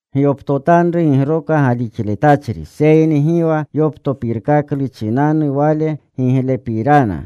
Gyoptotanru gigroka galixletachri, seyni gi wa yoptopirkaklu chinanu wale getlepirana.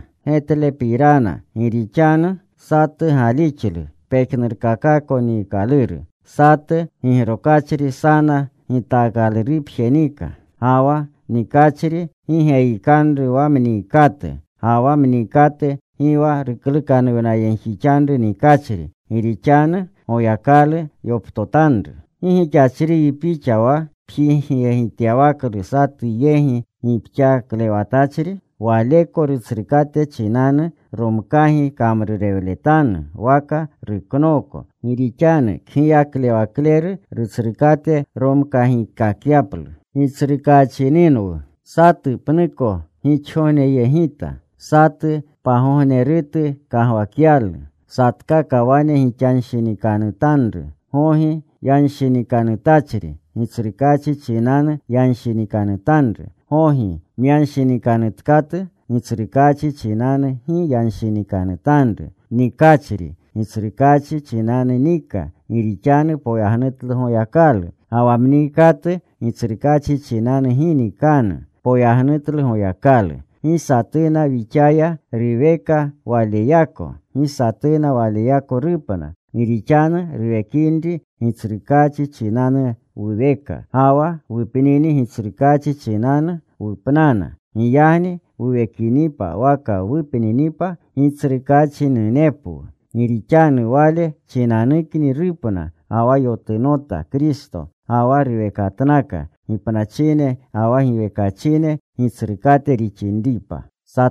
Gi rixanu satu galixlu pejnurkakako niikaluru. Satu gigrokachri sana gitaakalurupje nika. Ga wa nikachri gi geyikanru wa mniikatu. Ga wa mniikatu gi wa ruklukanuwnayegjixanru nikachri, gi rixanu Goyakalu yoptotanru. ¿Gi gixachriyi pixa wa pjigyegityawaklu satu yegi gipxaklewatachri? Waleko rutsrukate chinanu romkagi kamrurewletanu waka ruknooko. Gi rixanu kgiyaklewakleru rutsrukate romkagikakyaplu. Satu pnuko gixgogneyegita. Satu pagognerutu kagwakyalu. Satkaka wane gixanshinikanutanru. Gogi yanshinikanutachri, Gitsrukaachi chinanu yanshinikanutanru. Gogi myanshinikanutkatu Gitsrukaachi chinanu gi yanshinikanutanru. Nikachri Gitsrukaachi chinanu nika gi rixanu poyagnutlu Goyakalu. Ga wa mniikatu Gitsrukaachi chinanu gi nikanu. Poyagnutlu Goyakalu. Gi satuna wixaya ruweka waleyako. Gi satuna waleyako rupna. Gi rixanu wuwekini, Gitsrukaachi chinanu wuweka. Ga wa wupnini Gitsrukaachi chinanu wupnana. Giyagni wuwekinipa waka wupninipa Gitsrukaachinunepwu. Gi rixanu wale chinanukni rupna ga wa yotunota Kristo, ga wa ruwekatnaka, gipnachine ga wa giwekachine Gitsrukate rixinripa.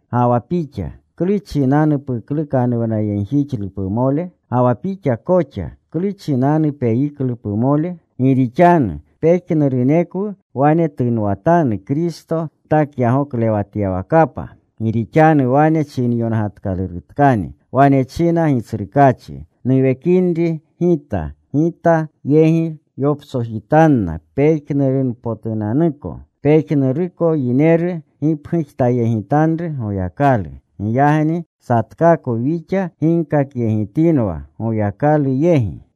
Ga wa pixa, ¿klu chinanu puklukanuwnayegjixlu pumole? Ga wa pixa koxa ¿klu chinanu peyiklu pumole? Gi rixanu pejnurunekwu wane tunwatanu Kristo gitakyagoklewatyawakapa. Gi rixanu wane chinayongatyawakatkani: Wane china Gitsrukaachi, Nuwekinri Gita, Gita yegi yoptsojitanna pejnurunpotunanuko. Pejnuruko yineru gipgujtayegitanru Goyakalu. Giyagni satkakwu wixa ginkakyegitinwa Goyakalu yegi.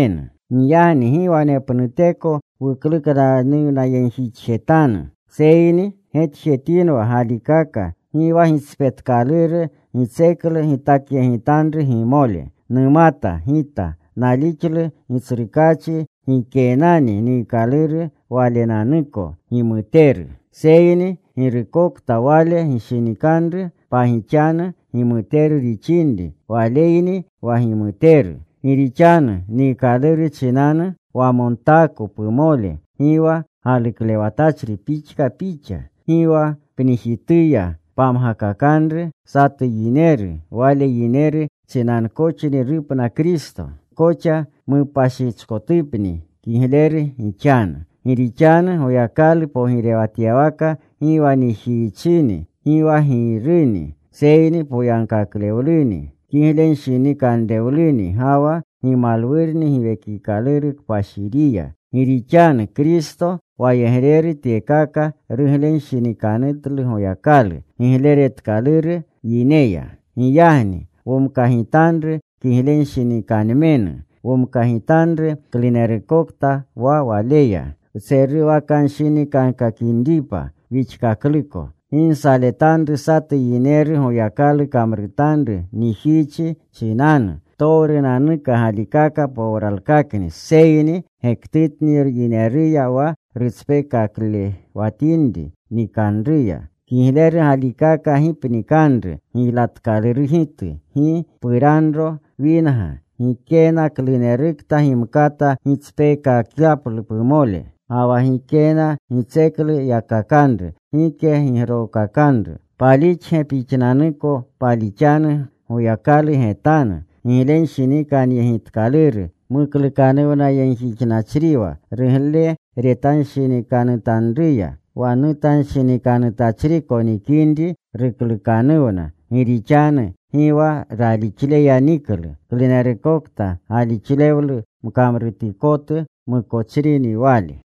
Giyagni gi wanepnuteko wuklukanuwnayegjixkakjetanu, seyni getjetinwa galikaka gi wa gitspetkaluru, gitseklu gitakyegitanru gimole. Numata gita, nalixlu Gitsrukaachi gikeenani niikaluru walenanuko gimuteru, seyni girukokta waleko gishinikanru pagixanu gimuteru rixinri waleyni wa gimuteru. Gi rixanu niikaluru chinanu wamontaako pumole, gi wa galuklewatachri pixka pixa. Gi wa pnijituya pamgakakanru satu yineru wale yineru chinankoxni rupna Kristo. Gi koxa mupashichkotupni kigleru gixanu. Gi rixanu Goyakalu pogirewatyawaka gi wa nijiichini, gi wa giiruni, seyni poyagkaklewluni, kiglenshinikanrewluni, ga wa gimuwluni Giwekikaluru Kpashiriya. Gi rixanu Kristo wayegreru tyeya ruglenshinikanutlu Goyakalu. Gigleretkaluru yineya. Giyagni womkagitanru kiglenshinikanmenu. Womkagitanru klunerukta wa waleya wtseruwakanshinikankakinripa wixkakluko. Gi nsaletanru satu yineru Goyakalu kamrutanru nijiichi chinanu. Ptowrunanuka galikaka powralkakni, seyni gektutni yineruya wa rutspekaklewatinri nikanruya. Kigleru galikaka gi pnikanru giylatkalurgitu, gi puranro winga, gikena klunerukta gimkata gitspeekakyaplu pumole, ga wa gikena gitseklu yakakanru, gike gigrokakanru. ¿Palixge? Pixnanuko palixanu Goyakalu getanu. Giglenshinikanyegitkaluru muklukanuwnayegjixnachriwa rugleretanshinikanutanruya. Wa nutanshinikanutachriko nikinri ruklukanuwna, gi rixanu gi wa ralixleya niklu. Klunerukokta galixlewlu mkamrutikotu mukochrini wale.